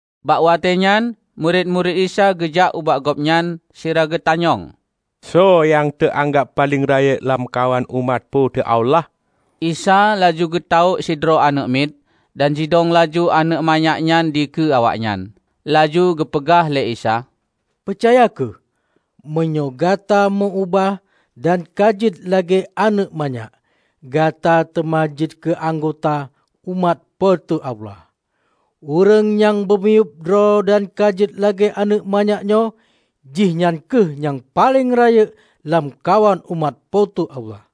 Bak watée nyan murit-murit Isa geujak ubak Gobnyan sira geutanyong, "Soe nyang teu-anggab paleng rayeuk lamkawan umat Po teu Allah?" Isa laju geutawök sidroe aneuëk mit, dan jidong laju aneuëk manyak nyan dikeue awaknyan. Laju geupeugah lé Isa, "Peucaya kheueh! Meunyoe gata meu-ubah dan ka jeuet lagée aneuëk manyak, gata teuma jeuet keu anggota umat Po teu Allah. Ureuëng nyang peumiyueb droe dan ka jeuet lagée aneuëk manyak nyoe, jihnyan kheueh nyang paleng rayeuk lamkawan umat Po teu Allah.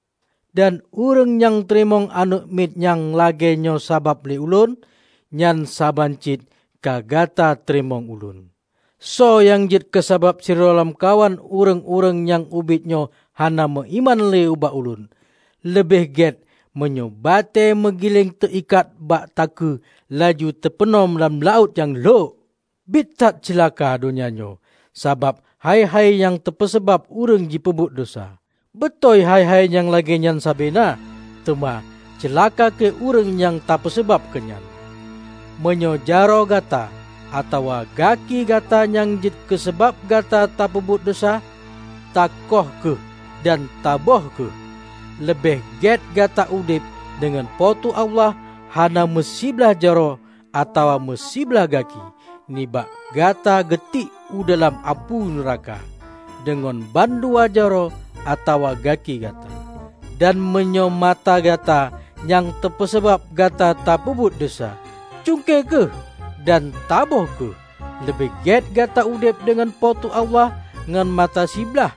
Dan ureuëng nyang teurimong aneuëk miet nyang lagée nyoe sabab lé Ulôn, nyan saban cit ka gata teurimong Ulôn." "Soe nyang jeuet keu sabab sidroe lamkawan ureuëng-ureuëng nyang ubit nyoe hana meuiman lé bak Ulôn, leubeh gét meunyoe batée meugileng teu-ikat bak takue laju teupeunom lam laôt nyang lhok. Biet that ceulaka donya nyoe sabab hai-hai nyang teupeusabab ureuëng jipeubuet desya. Beutôi hai-hai nyang lagée nyan sabe na, teuma ceulaka kheueh ureuëng nyang teupeusabab keunyan! Meunyoe jaroe gata atawa gaki gata nyang jeuet keusabab gata tapeubuet desya, takoih kheueh dan taböh kheueh. Leubeh gét gata udeb deungon Po teu Allah hana meusiblah jaroe atawa meusiblah gaki, nibak gata geutiek u dalam apui nuraka deungon ban dua jaroe atawa gaki gata. Dan meunyoe mata gata nyang teupeusabab gata tapeubuet desya, cungke kheueh dan taböh kheueh. Leubeh gét gata udeb deungon Po teu Allah ngon mata siblaih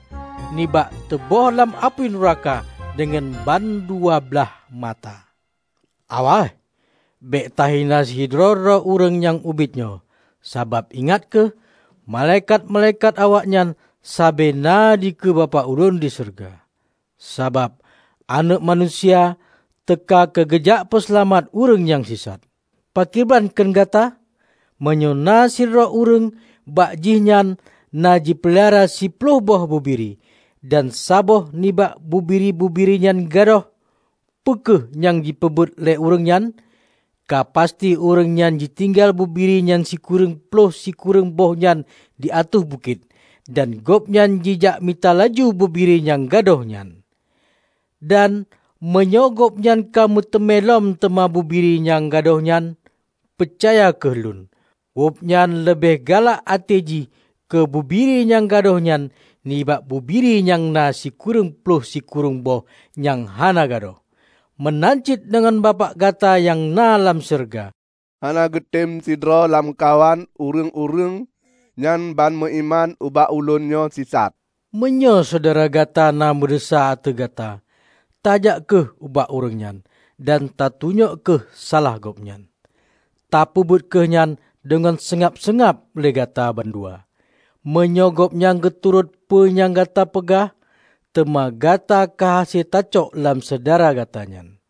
nibak teuböh lam apui nuraka deungon ban dua blaih mata." "Awaih! Bék tahina sidroe-droe ureuëng nyang ubit nyoe. Sabab ingat kheueh, malaikat-malaikat awaknyan sabe na dikeue Bapak Ulôn di syeuruga. Sabab Aneuëk Manusia teuka keu geujak peuseulamat ureuëng nyang sisat! Pakriban kheun gata? Meunyoe na sidroe ureuëng bak jih nyan na jipeulara siploh boh bubiri, dan saboh nibak bubiri-bubiri nyan gadôh, peu kheueh nyang jipeubuet lé ureuëng nyan? Ka pasti ureuëng nyan jitinggai bubiri nyang sikureueng ploh sikureueng boh nyan di ateueh bukét dan gobnyan jijak mita laju bubiri nyang gadôh nyan. Dan meunyoe gobnyan ka meuteumé lom teuma bubiri nyang gadôh nyan -- peucaya kheueh Lôn -- gobnyan leubeh galak até jih keu bubiri nyang gadôh nyan nibak bubiri nyang na si kureueng ploh sikureueng boh nyang hana gadôh. Meunan cit deungon Bapak gata nyang na lam syeuruga hana geutem sidroe lamkawan ureuëng-ureuëng nyang ban meuiman ubak Ulôn nyoe sisat." "Meunyoe syedara gata na meudesya ateueh gata, tajak kheueh ubak ureuëng nyan dan tatunyok kheueh salah gobnyan. Tapeubuet kheueh nyan deungon seungab-seungab lé gata bandua. Meunyoe gobnyan geuturot peue nyang gata peugah, teuma gata ka hase tacok lom syedara gata nyan.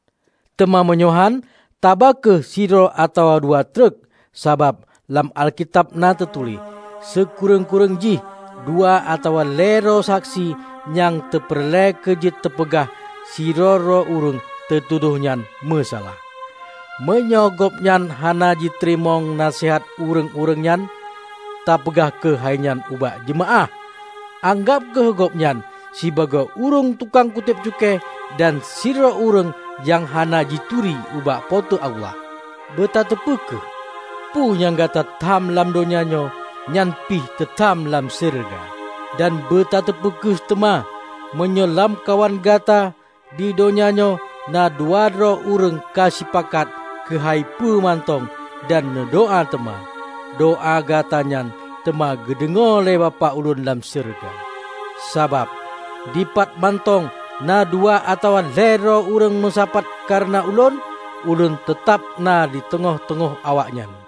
Teuma meunyoe hán, taba kheueh sidroe atawa dua treuk. Sabab lam Alkitab na teutuléh, 'Sikureueng-kureueng jih dua atawa lhée droe saksi nyang teupeureulée keu jeuet teupeugah sidroe-droe ureuëng teutudoh nyan meusalah.' Meunyoe gobnyan hana jiteurimong naseuhat ureuëng-ureuëng nyan, tapeugah kheueh hai nyan ubak jeumaáh, anggab kheueh gobnyan sibagoe ureuëng tukang kutéb cukée dan sidroe ureuëng nyang hana jituri ubak Po teu Allah." "Beutateupeu kheueh: Peue nyang gata tham lam donya nyoe, nyan pih teu tham dalam syeuruga. Dan beutateupeu kheueh teuma: Meunyoe lamkawan gata di donya nyoe na dua droe ureuëng ka sipakat keuhai peue mantong dan neudoá teuma, doá gata nyan teuma geudeungoe lé Bapak Ulôn lam syeuruga. Sabab, dipat mantong na dua atawa lhée droe ureuëng meusapat kareuna Ulôn, Ulôn teutab na di teungoh-teungoh awaknyan."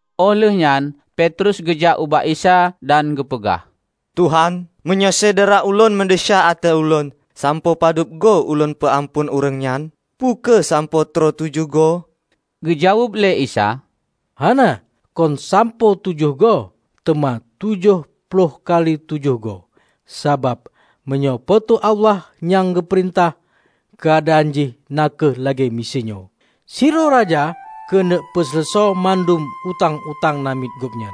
Óh lheueh nyan Petrus geujak ubak Isa dan geupeugah, "Tuhan, meunyoe syedara ulôn meudesya ateueh ulôn, sampoe padub goe ulôn peu-amphon ureuëng nyan? Peu kheueh sampoe troh tujoh goe?" Geujaweueb lé Isa, "Hana, kon sampoe tujoh goe, teuma tujoh ploh kali tujoh goe! Sabab meunyoe Po teu Allah nyang peurintah, keuadaan jih na kheueh lagée miseue nyoe: Sidroe raja keuneuk peuseuleusoe bandum utang-utang namiet gobnyan.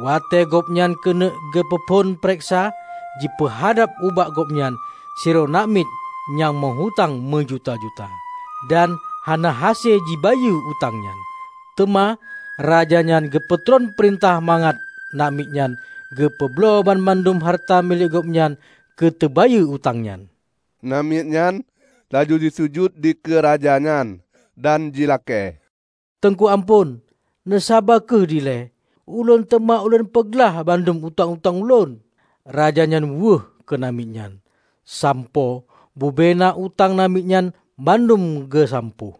Watée gobnyan keuneuk geupeu phon peureksa, jipeuhadab ubak gobnyan sidroe namiet nyang meu-utang meujuta-juta, dan hana hase jibayeue utang nyan. Teuma, raja nyan geupeutron peurintah mangat namiet nyan geupeubloe dan bandum hareuta milék gobnyan keu teubayeue utang nyan. Namiet nyan laju jisujut di keu raja nyan, dan jilakée, 'Teungku amphon, neusaba kheueh ilée. Ulôn teuma lôn peuglah bandum utang-utang lôn.' Raja nyan wéueh keu namiet nyan, sampoe bubena utang namiet nyan bandum geusampôh.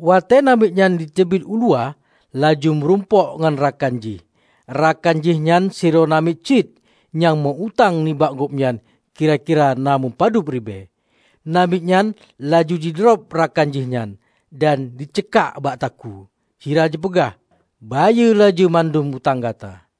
Watée namiet nyan jiteubiet u luwa, laju meurumpok ngon rakan jih, rakan jih nyan sidroe namiet cit, nyang meu-utang nibak gobnyan kira-kira na meupadub ribée. Namiet nyan laju jidrob rakan jih nyan dan ji ceukak bak takue, sira jipeugah, 'Bayeue laju bandum utang gata!'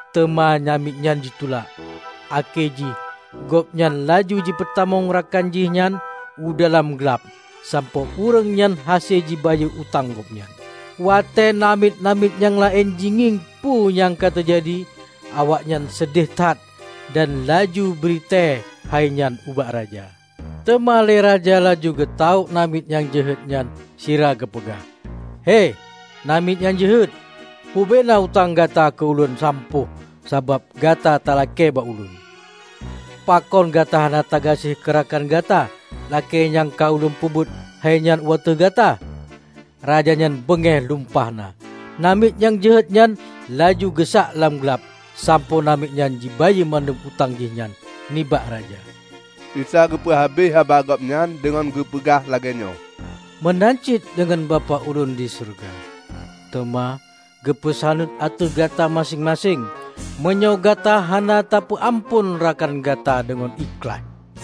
Teuma namiet nyan jitulak. Akhé jih gobnyan laju jipeutamong rakan jih nyan u dalam glab sampoe ureuëng nyan hase jibayeue utang gobnyan. Watée namiet-namiet nyang laén jingieng peue nyang ka teujadi, awaknyan seudeh that dan laju bri tée hai nyan ubak raja. Teuma lé raja laju geutawök namiet nyang jeuhet nyan sira geupeugah, 'Hei, namiet nyang jeuhet! Bubena utang gata ka ulôn sampôh sabab gata talakée bak ulôn. Pakon gata hana tagaséh keu rakan gata lagée nyang ka ulôn peubuet hai nyan u ateueh gata?' Raja nyan beungéh lumpah na. Namiet nyang jeuhet nyan laju geusak lam glab sampoe namiet nyan jibayeue bandum utang jihnyan nibak raja." Isa geupeu habéh haba Gobnyan deungon geupeugah lagée nyoe, "Meunan cit deungon Bapak Ulôn di syeuruga teuma geupeusaneut ateueh gata maséng-maséng, meunyoe gata hana tapeu amphon rakan gata deungon ikhlaih."